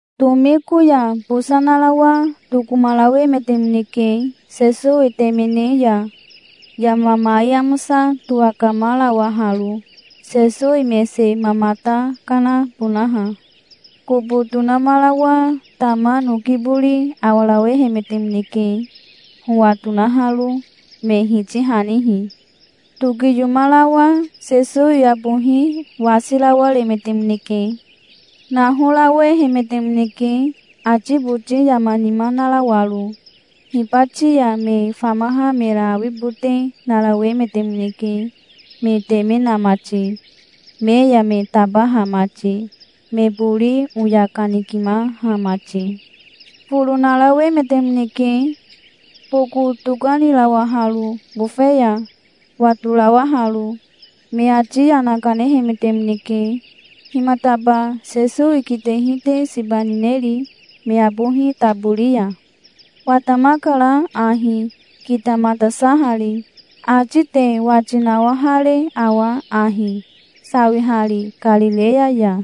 Tomiko ya bosa narawa tokomarawemetemoneke Sesowi temene ya, yama mai amosa towakamarawaharo, Sesowi mese mamata kanabonaha. Kobo tonamarawa tama noki bori awarawehemetemoneke, howa tonaharo, me hitihanihi. Tokiyomarawa Sesowi abohi wasirawaremetemoneke. Nahorawehemetemoneke, ati boti yama nima narawaro. Hibati ya me famaha mera awibote narawemetemoneke, me teme na mati, me ya me tabaha mati, me bori oya kanikimaha mati. Foro narawemetemoneke, boko tokanirawaharo bofe ya, watorawaharo. Me ati yana kanehemetemoneke. "Himataba Sesowi kitehi te siba nineri me abohi tabori ya? Watamakara ahi, kitamatasahari. Ati te wati nawahare awa ahi, sawihari Karireya ya?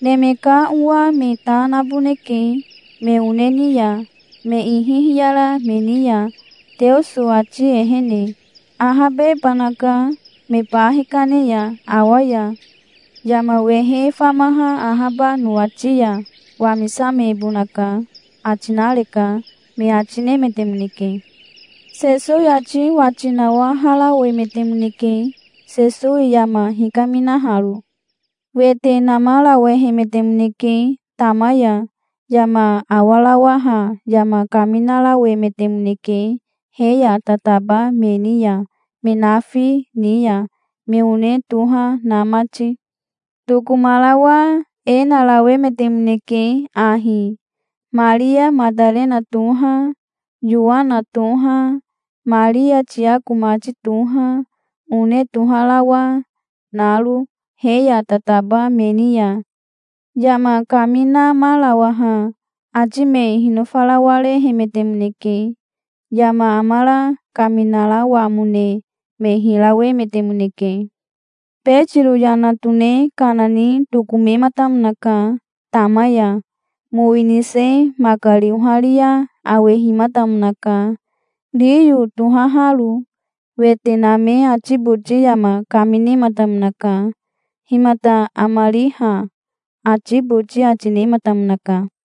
'Neme ka Owa me ta naboneke me one ni ya, me ihi hiyara me ni ya, Teoso ati ehene. Ahabebanaka, me ba hikane ya awa ya. Yama wehe famaha ahaba nowati ya wamisamebonaka', ati nareka", me ati nemetemoneke. Sesowi ati wati nawaharawemetemoneke, Sesowi yama hikaminaharo. Wete namarawehemetemoneke tama ya. Yama awarawaha yama kaminamarawemetemoneke he ya tataba me ni ya, me nafi ni ya, me one toha na mati. Tokomarawa e narawemetemoneke ahi, Maria Matarena toha, Yowana toha, Maria Tiako mati toha, one toharawa naro he ya tataba me ni ya. Yama kaminamarawaha ati me hinofarawarehemetemoneke. Yama amara kaminarawamone me hirawemetemoneke. Betiro yana tone kana ni tokomematamonaka tama ya. Mowi nise makari oharia awehimatamonaka, riyo tohaharo. Wete name ati boti yama kaminematamonaka. "Himata amari ha?" ati boti ati nematamonaka.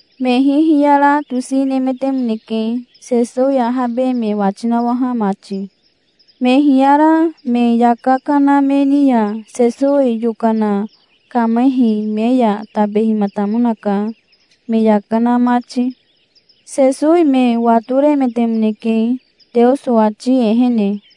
Me hihiyara tosi nemetemoneke, Sesowi ahabe me wati nawaha mati. Me hiyara me yaka kana me ni ya Sesowi yokana kamehi me ya tabehimatamonaka, me yaka na mati. Sesowi me watoremetemoneke, Teoso ati ehene.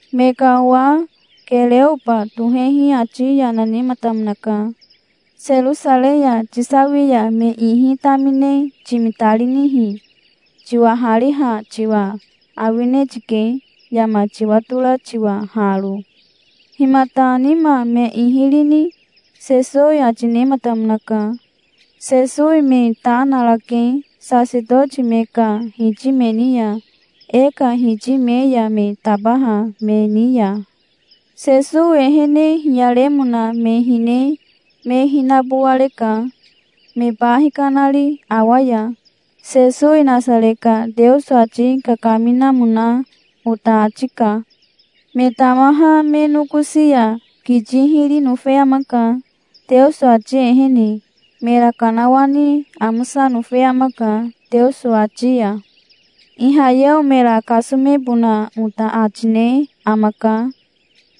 Me ka owa Kereoba tohehi ati yana nematamonaka. "Serosarei ya tisawi ya me ihi tamine timitarinihi? Tiwahariha tiwa awine tike, yama tiwatora tiwa haro". "Himata nima me ihi rini?" Sesowi ati nematamonaka. "Sesowi me ta narake sasetoti me ka hiti me ni ya, e ka hiti me ya me tabaha me ni ya. Sesowi ehene hiyaremona me hine me hinabowareka, me ba hikanari awa ya. Sesowi Nasare ka Teoso ati kakaminamona ota ati ka. Me tamaha me nokosi ya kiti hiri nofe amaka, Teoso ati ehene. Mera kanawani amosa nofe amaka, Teoso ati ya. Ihayeo mera kasomebona ota ati ne amaka.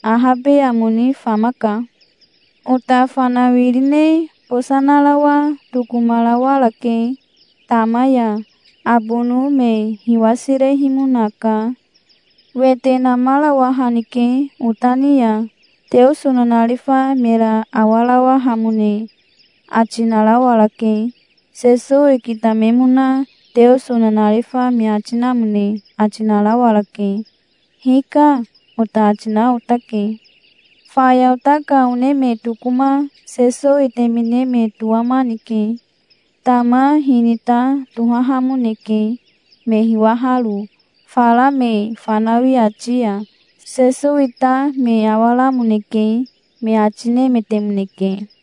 Ahabe amo ni famaka. Ota fanawirine bosa narawa tokomarawarake tama ya. Abono me hiwasirehimonaka. Wete namarawahanike ota ni ya. Teoso nanarifa mera awarawahamone ati narawarake. Sesowi kitamemona Teoso nanarifa me ati namone ati narawarake. 'Hika', ota ati na otake. Faya ota ka one me tokoma Sesowi temene me towamanike. Tama hinita tohahamoneke, me hiwaharo, fara me fanawi ati ya. Sesowi ta me awaramoneke", me ati nemetemoneke.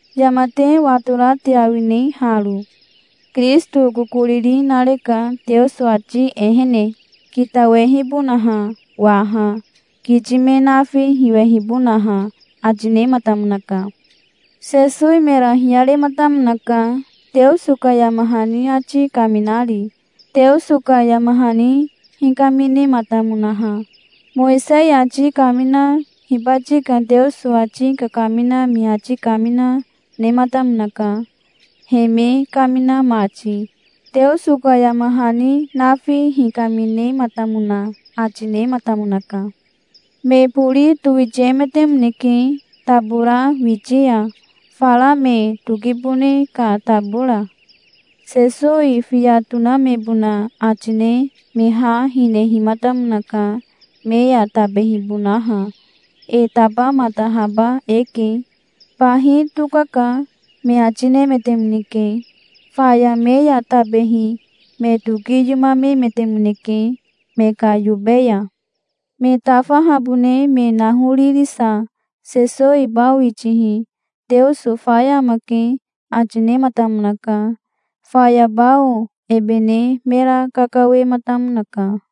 Yama te watora te awine haro? Kirisito kokoriri nareka Teoso ati ehene, kitawehibonaha waha, kiti me nafi hiwehibonaha", ati nematamonaka. Sesowi mera hiyarematamonaka, Teoso ka yama hani ati kaminari, Teoso ka yama hani hikaminematamonaha. Mowisei ati kamina, hibati ka Teoso ati kakamina me ati kamina, nematamonaka, he me kamina mati. Teoso ka yama hani nafi hikaminematamona ati nematamonaka. Me bori towitiemetemoneke tabora witi ya, fara me tokibone ka tabora. Sesowi fiya tonamebona ati ne me ha hinehimatamonaka, me ya tabehibonaha. "E tabamatahaba eke. Bahi tokaka", me ati nemetemoneke. Faya me ya tabehi me tokiyomamemetemoneke me ka yobe ya. Me tafahabone me nahoririsa Sesowi bao itihi "Teoso faya amake", ati nematamonaka. Faya bao ebe ne mera kakawematamonaka.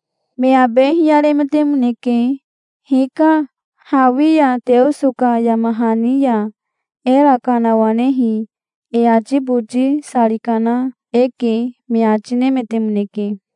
Me abe hiyaremetemoneke. "Hika. Hawi ya Teoso ka yama hani ya era kanawanehi e ati boti sari kana eke", me ati nemetemoneke.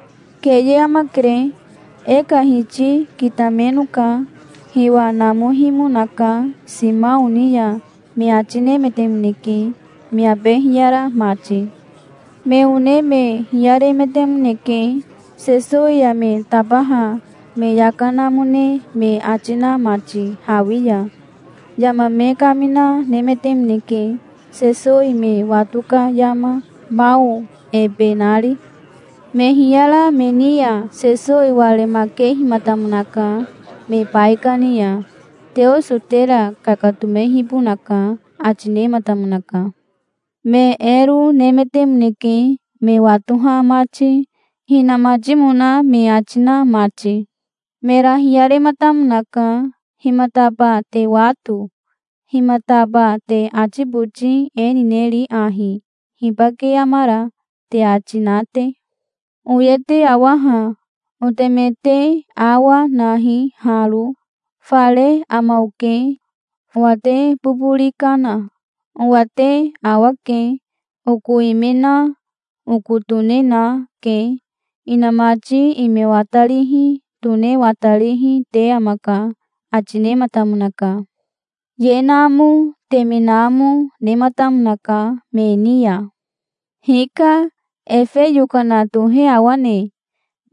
"Keye amakere. E ka Hiti kitamenoka. Hiwa namohimonaka Simao ni ya", me ati nemetemoneke, me abe hiyara mati. Me one me hiyaremetemoneke, Sesowi ya me tabaha me yaka namone me ati na mati hawi ya. Yama me kamina nemetemoneke, Sesowi me wato ka yama, bao ebe nari. Me hiyara me ni ya Sesowi waremakehimatamonaka me baikani ya. "Teoso tera kakatomehibonaka", ati nematamonaka. Me ero nemetemoneke, me watoha mati, hinamatimona me ati na mati. Mera hiyarematamonaka. "Himataba te wato? Himataba te ati boti e nineri ahi: 'Hibake amara?' te ati na te? Oye te awa ha. Oteme te awa nahi haro. Fare ama oke. Owa te bobori kana. Owa te awake. Oko ime na, oko tone na, ke. Inamati ime watarihi, tone watarihi, te amaka", ati nematamonaka. Ye namo, teme namo, nematamonaka me ni ya. "Hika. Efe yokana tohe awane?"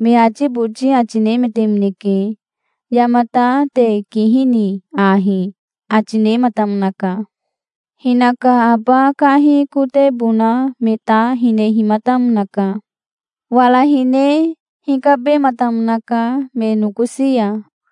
me ati boti ati nemetemoneke. "Yamata te kihini ahi?" ati nematamonaka. Hinaka aba kahi kotebona me ta hinehimatamonaka. Wara hine hikabematamonaka me nokosi ya.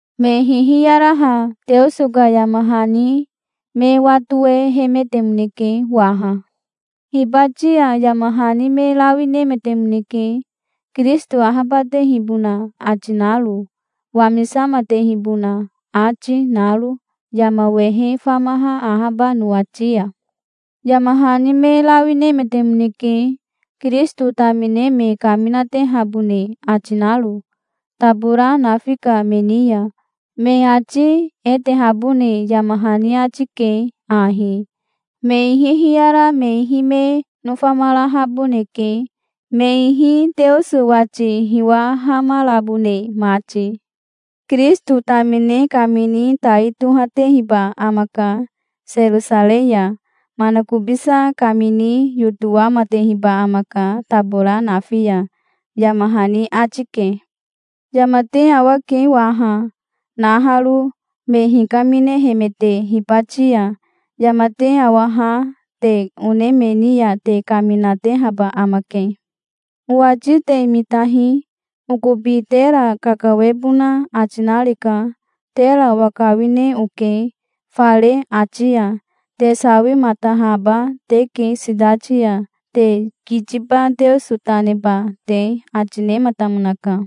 Me hihiyaraha Teoso ka yama hani me watowehemetemoneke waha. "Hibati ya yama hani me rawi nemetemoneke Kirisito ahabatehibona ati naro, wamisamatehibona ati naro yama wehe famaha ahaba nowati ya. Yama hani me rawi nemetemoneke, Kirisito tamine me kaminatehabone ati naro, tabora nafi ka me ni ya. Me ati e tehabone yama hani ati ke ahi: Me ihi hiyara me ihi me nofamarahaboneke, me ihi Teoso wati hiwahamarabone mati. Kirisito tamine kamini tai tohatehiba amaka Serosarei ya. Manakobisa kamini yotowamatehiba amaka tabora nafi ya, yama hani ati ke. Yama te awake waha, naharo, me hikaminehemete hibati ya. Yama te awaha te one me ni ya te kaminatehaba amake. Owati te mitahi. Okobi tera kakawebona ati nareka. Tera owakawine oke fare ati ya. Te sawimatahaba teke sitati ya, te kitiba Teoso ta neba te", ati nematamonaka.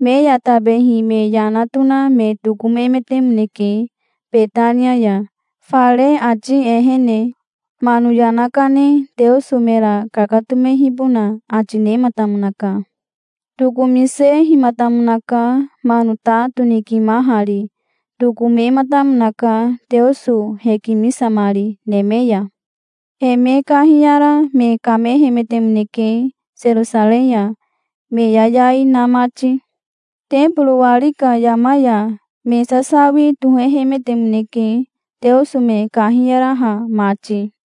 Me ya tabehi me yana tona me tokomemetemoneke Betania ya, fare ati ehene. Mano yana kane Teoso mera kakatomehibona ati nematamonaka. Tokomisehimatamonaka mano ta tonikimahari. Tokomematamonaka, Teoso hekimisamari neme ya. He me kahiyara me kamehemetemoneke Serosarei ya, me yayai na mati. Teboro wari ka yama ya me sasawi tohehemetemoneke, Teoso me kahiyaraha mati.